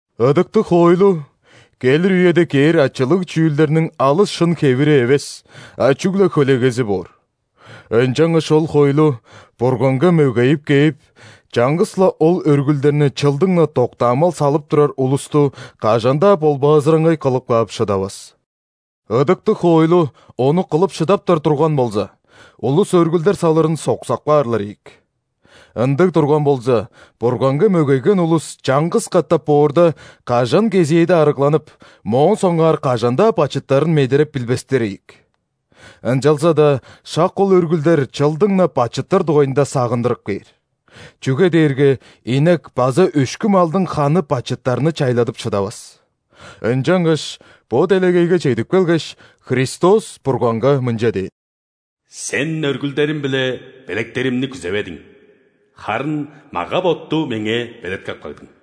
Ыдыктыг хоойлу – келир үеде кээр ачылыг чүүлдерниң алыс шын хевири эвес, а чүгле хөлегези боор. Ынчангаш ол хоойлу Бурганга мөгейип кээп, чаңгыс-ла ол өргүлдерни чылдың-на доктаамал салып турар улусту кажан-даа ·болбаазыраңгай кылып каап шыдавас. Ыдыктыг хоойлу ону кылып шыдаптар турган болза, улус өргүлдер салырын соксап каарлар ийик. Ындыг турган болза, Бурганга мөгейген улус чаңгыс катап боорда, кажан кезээде арыгланып, моон соңгаар кажан-даа бачыттарын медереп билбестер ийик. Ынчалза-даа шак ол өргүлдер чылдың-на бачыттар дугайында сагындырып кээр. Чүге дээрге инек база өшкү малдың ханы бачыттарны чайладып шыдавас. Ынчангаш бо делегейге чедип келгеш, Христос Бурганга мынча дээн:«Сен өргүлдерим биле белектеримни күзеведиң,харын мага-ботту Меңээ белеткеп кагдың.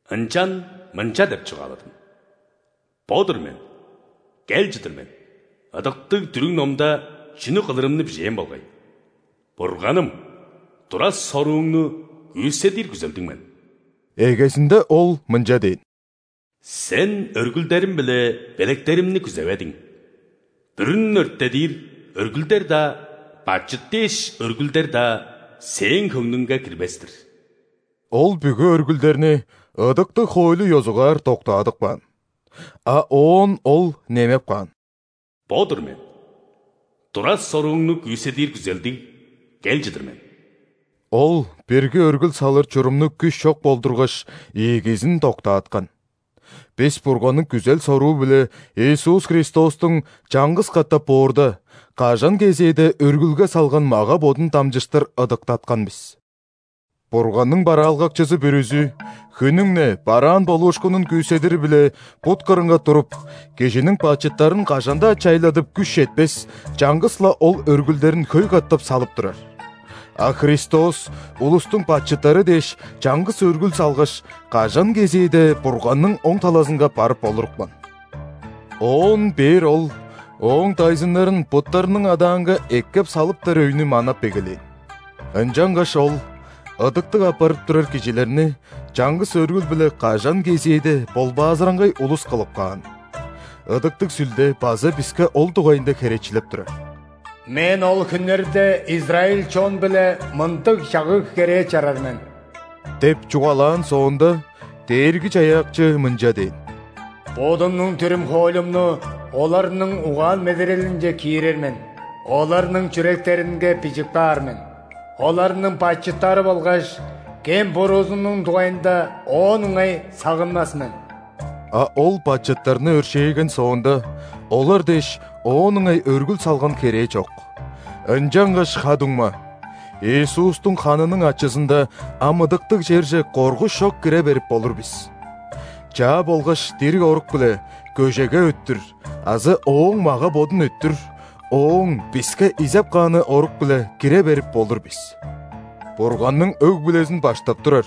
Ынчан мынча деп чугааладым: „Бо-дур мен, кел чыдыр мен,ыдыктыг дүрүг-номда чүнү кылырымны бижээн болгай.Бурганым, тура-сорууңну күүседир күзелдиг мен“». Эгезинде Ол мынча дээн: «Сен өргүлдерим биле белектеримни күзеведиң, бүрүн өрттедир өргүлдер-даа, бачыт дээш өргүлдер-даа Сээң хөңнүңге кирбес-тир». (Ол бүгү өргүлдерни ыдыктыг хоойлу ёзугаар доктаадып каан.) А оон Ол немеп каан: «Бо-дур мен, тура-сорууңну күүседир күзелдиг кел чыдыр мен». Ол бирги өргүл салыр чурумну күш чок болдургаш, ийигизин доктааткан. Бис Бурганның күзел-соруу-биле Иисус Христостуң чаңгыс катап боорда, кажан кезээде өргүлге салган мага-бодун дамчыштыр ыдыктаткан бис. Бурганның бараалгакчызы бүрүзү хүннүң-не бараан болуушкунун күүседири-биле бут кырынга туруп, кижиниң бачыттарын кажан-даа чайладып күш четпес чаңгыс-ла ол өргүлдерин хөй катап салып турар. А Христос улустуң бачыттары дээш чаңгыс өргүл салгаш, кажан кезээде Бурганның оң талазынга барып олурупкан. Оон бээр Ол Ооң дайзыннарын буттарының адаанга эккеп салыптар өйнү манап эгелээн. Ынчангаш Ол ыдыктыг апарып турар кижилерни чаңгыс өргүл-биле кажан кезээде ·болбаазыраңгай улус кылып каан. Ыдыктыг Сүлде база биске ол дугайында херечилеп турар. «Мен ол хүннерде израиль чон-биле мындыг чагыг-керээ чарар мен» – деп чугаалаан соонда, Дээрги-Чаяакчы мынча дээн:«Бодумнуң дүрүм-хоойлумну оларның угаан-медерелинче киирер мен,оларның чүректеринге бижип каар мен. Оларның бачыттары болгаш кем-буруузунуң дугайында оон ыңай сагынмас мен». А ол бачыттарны өршээген соонда, олар дээш оон ыңай өргүл салган херээ чок. Ынчангаш, ха-дуңма, Иисустуң ханының ачызында ам ыдыктыг черже коргуш чок кире берип болур бис. Чаа болгаш дириг орук-биле, көжеге өттүр (азы Ооң мага-бодун өттүр) Ооң биске изеп кааны орук-биле кире берип болур бис. Бурганның өг-бүлезин баштап турар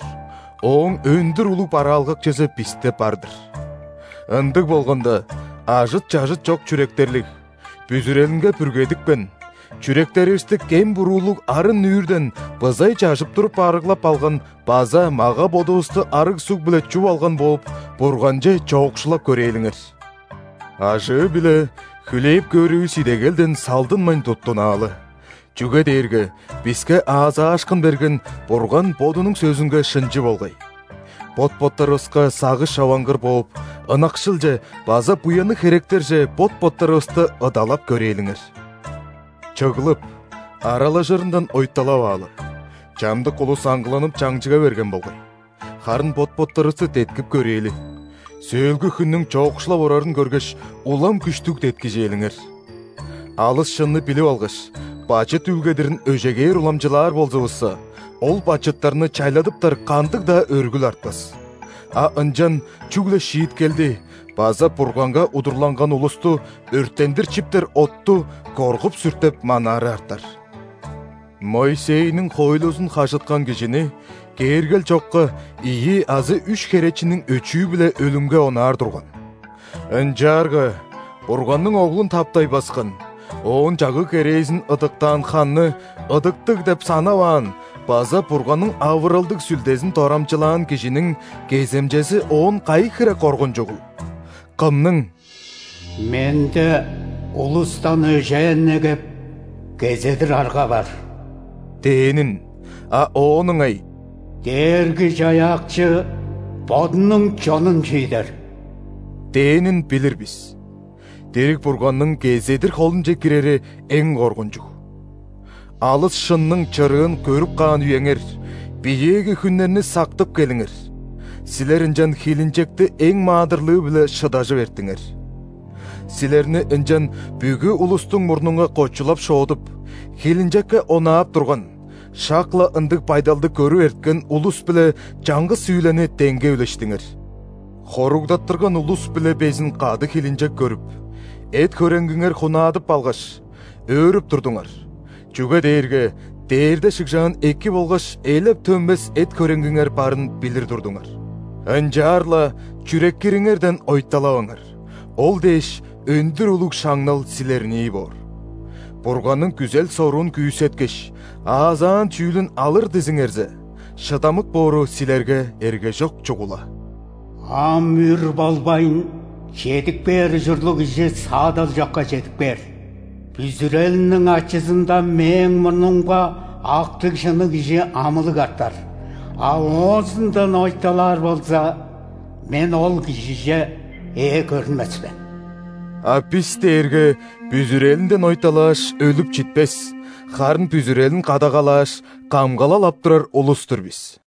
Ооң өндүр улуг бараалгакчызы бисте бар-дыр. Ындыг болганда, ажыт-чажыт чок чүректерлиг; бүзүрелинге бүргедипкен; чүректеривисти кем-буруулуг арын-нүүрден бызай чажып туруп арыглап алган база мага-бодувусту арыг суг-биле чуп алган бооп, Бурганче чоокшулап көрээлиңер. Ажыы-биле хүлээп көөрүвүс идегелден салдынмайн туттунаалы, чүге дээрге биске аазаашкын берген Бурган Бодунуң сөзүнге шынчы болгай. Бот-боттарывыска сагыш човангыр бооп, ынакшылче база буянныг херектерже бот-боттарывысты ыдалап көрээлиңер. Чыглып, аралажырындан ойталаваалы (чамдык улус аңгыланып чаңчыга берген болгай), харын бот-боттарывысты деткип көрээли, сөөлгү хүннүң чоокшулап орарын көргеш, улам күштүг деткижээлиңер. Алыс шынны билип алгаш, бачыт үүлгедирин өжегээр уламчылаар болзувусса, ол бачыттарны чайладыптар кандыг-даа өргүл артпас. А ынчан чүгле шииткелди база Бурганга удурланган улусту өрттендир чиптер отту коргуп-сүртеп манаары артар. Моисейниң хоойлузун хажыткан кижини кээргел чокка ийи азы үш херечиниң өчүү-биле өлүмге онаар турган. Ынчаарга Бурганның Оглун таптай баскан, Ооң чагыг-керээзин ыдыктаан ханны ыдыктыг деп санаваан база Бурганның авыралдыг Сүлдезин дорамчылаан кижиниң кеземчези оон кайы хире коргунчугул?! Кымның: «Менде улустан өжээн негеп, кезедир арга бар» – дээнин, а оон ыңай: «Дээрги-Чаяакчы Бодунуң чонун шиидер» – дээнин билир бис. Дириг Бурганның кезедир холунче кирери эң коргунчуг! Алыс шынның чырыын көрүп каан үеңер – биеэги хүннерни сактып келиңер, силер ынчан хилинчекти эң маадырлыы-биле шыдажып эрттиңер. Силерни ынчан бүгү улустуң мурнунга кочулап-шоодуп, хилинчекке онаап турган, шак-ла ындыг байдалды көрүп эрткен улус-биле чаңгыс үүлени деңге үлештиңер. Хоругдаттырган улус-биле безин кады хилинчек көрүп, эт-хөреңгиңер хунаадып алгаш, өөрүп турдуңар, чүге дээрге дээрде шыгжаан эки болгаш элеп төнмес эт-хөреңгиңер барын билир турдуңар. Ынчаар-ла чүреккириңерден ойталаваңар, ол дээш, өндүр улуг шаңнал силернии боор. Бурганның күзел-соруун күүсеткеш, аазаан чүүлүн алыр дизиңерзе, шыдамык боору силерге эргежок чугула. «Ам үр болбайн, чедип кээр ужурлуг Кижи саадал чокка чедип кээр. Бүзүрелиниң ачызында Мээң мурнумга актыг-шынныг кижи амылыг артар,а оозундан ойталаар болза, Мен ол кижиже ээ көрүнмес мен». А бис дээрге бүзүрелинден ойталааш, өлүп читпес, харын бүзүрелин кадагалааш, камгалал ап турар улус-тур бис.